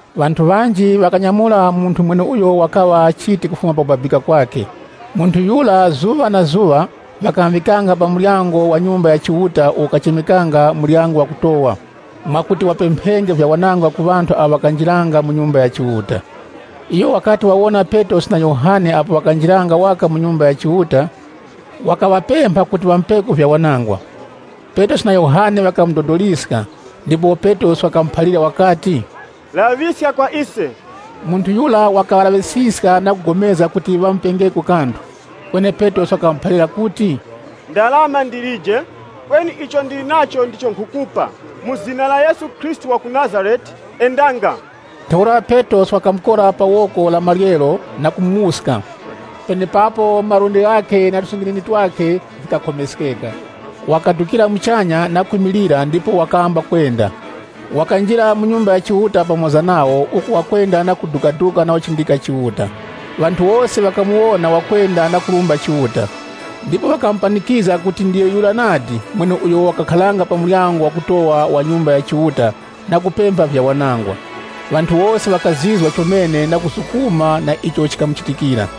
Ŵanthu ŵanji ŵakanyamura munthu mweneuyo wakaŵa chiti kufuma pakubabika kwakhe. Munthu yura zuŵa na zuŵa ŵakamuŵikanga pa muryango wa Nyumba ya Chiuta uwo ukachemekanga “Muryango Wakutowa,” mwakuti wapemphenge vyawanangwa ku ŵanthu awo ŵakanjiranga mu Nyumba ya Chiuta. Iyo wakati wawona Petrosi na Yohane apo ŵakanjiranga waka mu Nyumba ya Chiuta, wakaŵapempha kuti ŵamupeko vyawanangwa. Petrosi na Yohane ŵakamudodoliska, ndipo Petrosi wakamuphalira wakati, “Laŵiska kwa ise!” Munthu yura wakaŵalaŵisiska na kugomezga kuti wapokengeko kanthu. Kweni Petrosi wakamuphalira kuti, “Ndarama za siliva na golide ndilije, kweni icho ndili nacho ndicho nkhukupa: mu zina la Yesu Khristu wa ku Nazarete, ‘Endanga.’” Ntheura Petrosi wakamukora pa woko la maryero na kumuwuska. Penepapo malundi ghakhe na tusinginini twakhe vikakhomeskeka. Wakadukira muchanya na kwimilira ndipo wakamba kwenda. Wakanjira mu Nyumba ya Chiuta pamoza nawo uku wakwenda na kudukaduka na kuchindika Chiuta. Ŵanthu wose ŵakamuwona wakwenda na kurumba Chiuta, ndipo ŵakamupanikizga kuti ndiyo yura nadi mweneuyo wakakharanga pa Muryango Wakutowa wa Nyumba ya Chiuta na kupempha vyawanangwa. Ŵanthu wose ŵakazizwa chomene na kuzukuma na icho chikamuchitikira.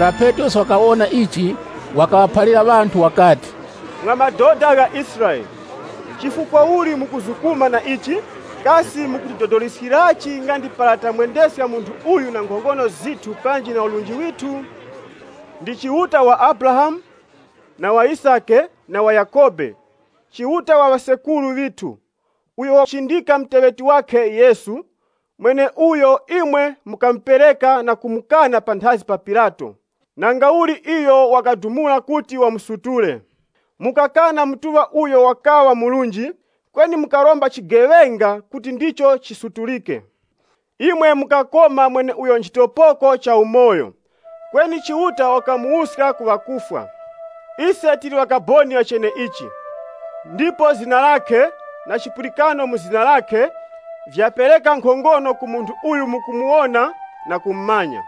Para Petrosi wakawona ichi, wakaŵaphalira ŵanthu wakati, Mwa madoda gha Israele, chifukwa uli mukuzukuma na ichi? Kasi mukutidodoliskirachi nga ndi para tamwendeska munthu uyu na nkhongono zithu panji na urunji withu? Ndi Chiuta wa Abrahamu, na wa Yisake, na wa Yakhobe, Chiuta wa ŵasekuru ŵithu, uyo wachindika muteŵeti wakhe Yesu, mweneuyo imwe mukamupereka na kumukana panthazi pa Pilato, nangauli iyo wakadumula kuti wamusutule. Mukakana Mutuŵa na Murunji Yura, kweni mukaromba chigeŵenga kuti ndicho chisutulike. Imwe mukakoma mweneuyo nchitopoko cha umoyo, kweni Chiuta wakamuwuska ku ŵakufwa. Ise tili ŵakaboni ŵa cheneichi. Ndipo zina lakhe, na chipulikano mu zina lakhe, vyapereka nkhongono ku munthu uyu mukumuwona na kumumanya.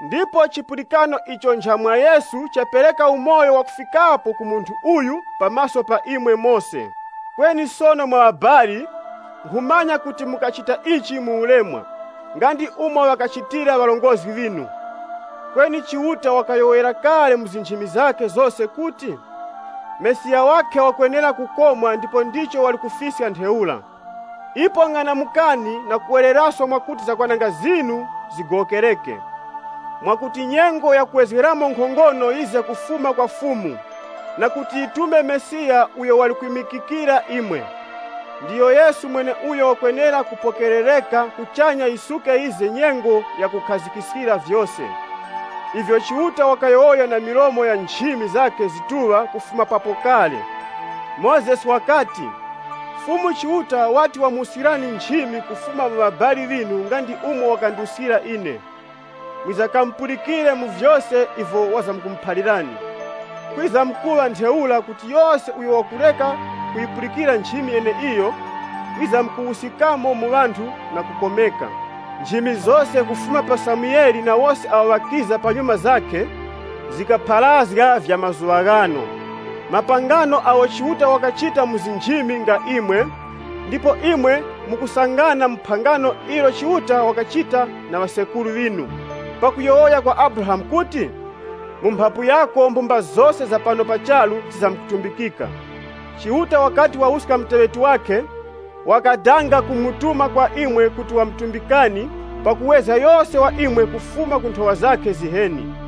Ndipo chipulikano icho ncha mwa Yesu chapereka umoyo wakufikapo ku munthu uyu pa maso pa imwe mose. “Kweni sono mwa ŵabali, nkhumanya kuti mukachita ichi mu ulemwa, nga ndi umo ŵakachitira ŵarongozgi ŵinu. Kweni Chiuta wakayowoyera kale mu nchimi zose kuti, Mesiya wakhe wakwenera kukomwa ndipo ndicho wali kufiska ntheura. Ipo ng'anamukani na kuwereraso kuti zakwananga zinu zigowokereke, mwakuti nyengo ya kuwezgeramo nkhongono yize kufuma kwa Fumu, na kuti yitume Mesiya uyo wali kwimikikira imwe. Ndiyo Yesu mweneuyo wakwenera kupokerereka kuchanya yisuke yize nyengo ya kukhazikiskira vyose, ivyo Chiuta wakayowoya na milomo ya nchimi zakhe zakupatulika kufuma papo kale. Mozesi wakati, ‘Fumu Chiuta wati wamwimikirani nchimi kufuma mu ŵabali ŵinu nga ndi umo wakandimikira ine. Mwizakamupulikire mu vyose ivyo wizamkumuphalirani. (LXX) Kwizamkuŵa ntheura kuti yose uyo wakureka kuyipulikira nchimi yeneiyo, wizamkuwuskikamo mu ŵanthu na kukomeka.’ Nchimi zose kufuma pa Samuele na wose awo ŵakiza kunyuma zakhe, zikapharazga vya mazuŵa ghano. Mapangano agho Chiuta wakachita mu nchimi nga imwe, ndipo imwe mukusangana mu phangano ilo Chiuta wakachita na ŵasekuru ŵinu, pakuyowoya kwa Abrahamu kuti, ‘Mu mphapu yako mafuko ghose gha pano pa charu ghizamkutumbikika.’ Chiuta wakati wawuska muteŵeti wakhe, wakadanga kumutuma kwa imwe kuti wamutumbikani, pakuwezga yose wa imwe kufuma ku nthowa zakhe ziheni.”